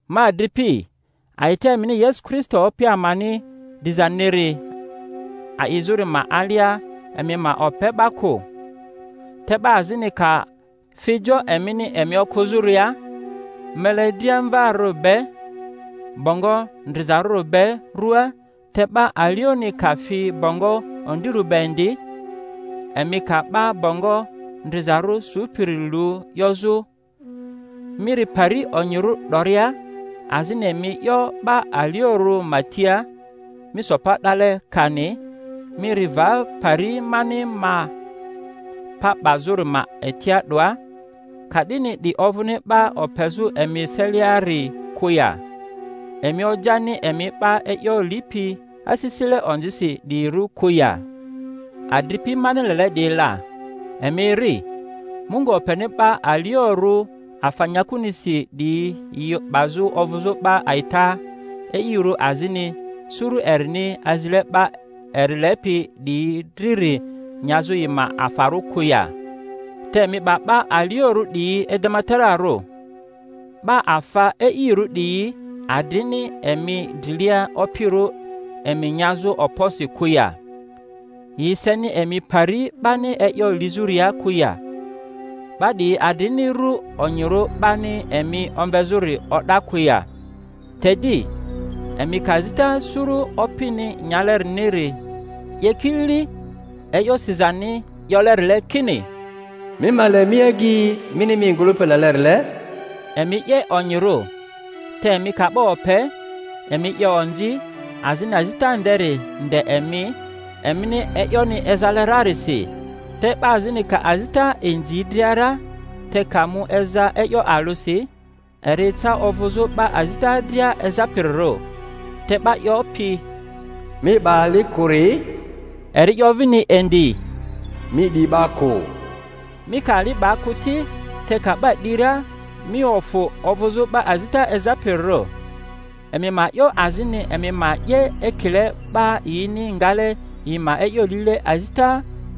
Ma adripi, a'ita emini Yesu Kristo Opi amani dizaniri a'izᴜri ma alia, emi ma ope 'ba kᴜ. Te 'ba azini ka fi jo emini emi okᴜzᴜria mele driamvaari be, bongo ndrizarᴜri be ruaa, te 'ba alioni ka fi bongo ondirᴜ be indi; emi ka 'ba bongo ndrizarᴜ supiri lu 'yozᴜ, Mi ri pari onyirᴜ 'doria; azini emi 'yo 'ba aliorᴜ ma tia, Mi so pa 'dale, kani, Mi ri va pari mani ma pa 'bazᴜri ma etia 'doa; ka'dini 'di ovᴜni 'ba opezᴜ emi eseliari kᴜ ya, emi ojani emi 'ba e'yo lipi asisile onzisi 'diyirᴜ kᴜ ya? Adripi mani lele 'diyi la, emi eri. Mungu openi 'ba aliorᴜ afa nyakunisi 'diyi yi 'bazᴜ ovᴜzᴜ 'ba a'ita e'irᴜ, azini suru erini azile 'ba eri lepi 'diyi driri nyazᴜ yi ma afarᴜ kᴜ ya? Te emi 'ba 'ba aliorᴜ 'diyi edematararᴜ. 'Ba afa e'irᴜ 'diyi adrini emi drilia opirᴜ emi nyazᴜ okposi kᴜ ya? Yi seni emi pari 'bani e'yo lizᴜria kᴜ ya? 'Ba 'diyi adrini ru onyirᴜ 'bani emi omvezᴜri o'da kᴜ ya? Te di, emi ka azita suru opini nyaleriniri 'ye kilili e'yo sizani 'yolerile, kini, Mi ma le mi agyi mini mi ngᴜlᴜpi lelerile; emi 'ye onyirᴜ. Te emi ka 'ba ope, emi 'ye onzi, azini azita nderi nde emi, emini e'yoni ezale rarisi. Te 'ba azini ka azita inzi dria ra, te ka mu eza e'yo alᴜsi, eri eca ovᴜzᴜ 'ba azita dria ezapirirᴜ. Te 'ba 'yopi, Mi 'ba ali kᴜ-ri, eri 'yo vini indi, Mi 'di 'ba kᴜ. Mi ka ali 'ba kᴜ ti, te ka 'ba 'di ra, mi ofᴜ ovᴜzᴜ 'ba azita ezapirirᴜ. Emi ma 'yo azini emi ma 'ye ekile 'ba yini ngale yi ma e'yo lile azita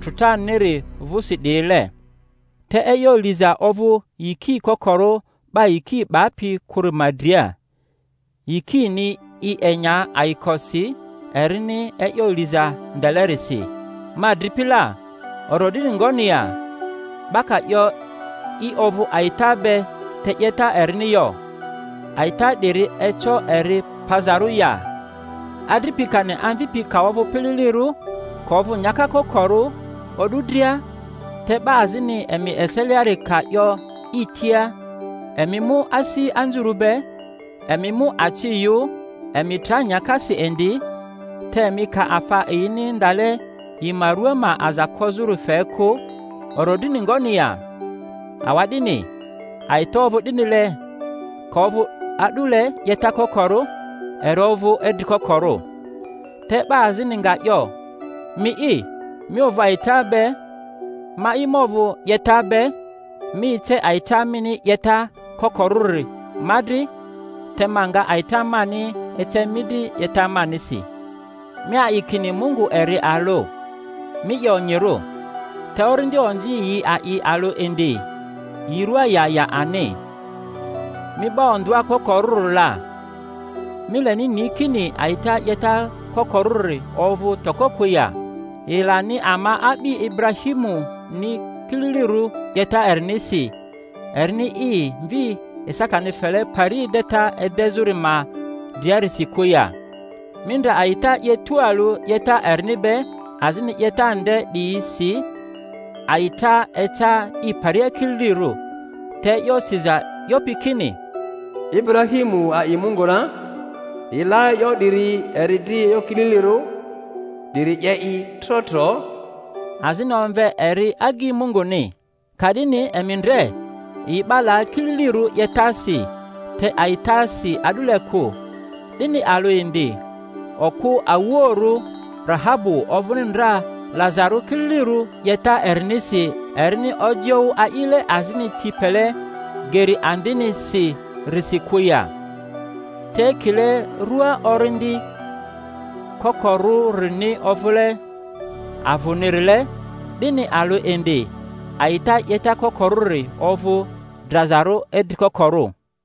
trᴜtaniri vᴜsi 'diyile. Te e'yo liza ovᴜ yiki kokorᴜ 'ba yiki 'bapi kᴜri ma dria; yikini i enya ayikosi erini e'yo liza ndelerisi. Ma adripi la, orodrini ngoni ya, 'ba ka 'yo i ovᴜ a'ita be, te 'yeta erini yo? A'ita 'diri eco eri pazarᴜ ya? Adripi kani amvipi ka ovᴜ pililirᴜ, ka ovᴜ nyaka kokorᴜ o'du dria, te 'ba azini emi eseliari ka 'yo yi tia, Emi mu asi anzurᴜ be, emi mu aci yᴜ, emi tra nyakasi indi; te emi ka afa yini ndale yi ma rᴜa ma aza kozᴜri fe kᴜ, orodrini ngoni ya? Awa'dini a'ita ovᴜ 'dinile: ka ovᴜ a'dule 'yeta kokorᴜ, eri ovᴜ idri kokorᴜ. Te 'ba azini nga 'yo, Mi'i mi ovᴜ a'ita be, ma'i ma ovᴜ 'yeta be. Mi ece a'ita mini 'yeta kokorᴜri ma dri, te ma nga a'ita mani ece mi dri 'yeta manisi. Mi a'i kini Mungu eri alᴜ; mi 'ye onyirᴜ. Te orindi onzi yi a'i alᴜ indi—yi rᴜa ya ya ani. Mi 'ba ondᴜa kokorᴜri la, mi leni ni kini a'ita 'yeta kokorᴜri ovᴜ toko, kᴜ ya? Yi lani ama a'bi Iburahimuni kililiru 'yeta erinisi, erini i mvi Isakani fele pari edeta edezᴜri ma driarisi kᴜ ya? Mi ndre a'ita 'ye tualᴜ 'yeta erini be, azini 'yeta nde 'diyisi a'ita eca i paria kililirᴜ, te e'yo siza 'yopi kini, Iburahimu a'i Mungu ra, yi la e'yo 'diri eri dri e'yo kililirirᴜ, 'diri 'ye i trotro; azini omve eri agyi Munguni. Ka'dini emi ndre yi 'ba la kililirᴜ 'yetasi, te a'itasi a'dule kᴜ. 'Dini alᴜ indi, okᴜ awuoᴜrᴜ Rahabu ovᴜni ndra lazarᴜ kililirᴜ 'yeta erinisi, erini ojioᴜ a'ile azini ti pele geri andinisi-risi kᴜ ya? Te ekile rua orindi kokorᴜrini ovᴜle avᴜnirile, 'dini alᴜ indi a'ita 'yeta kokorᴜri ovᴜ drazarᴜ idri kokorᴜ.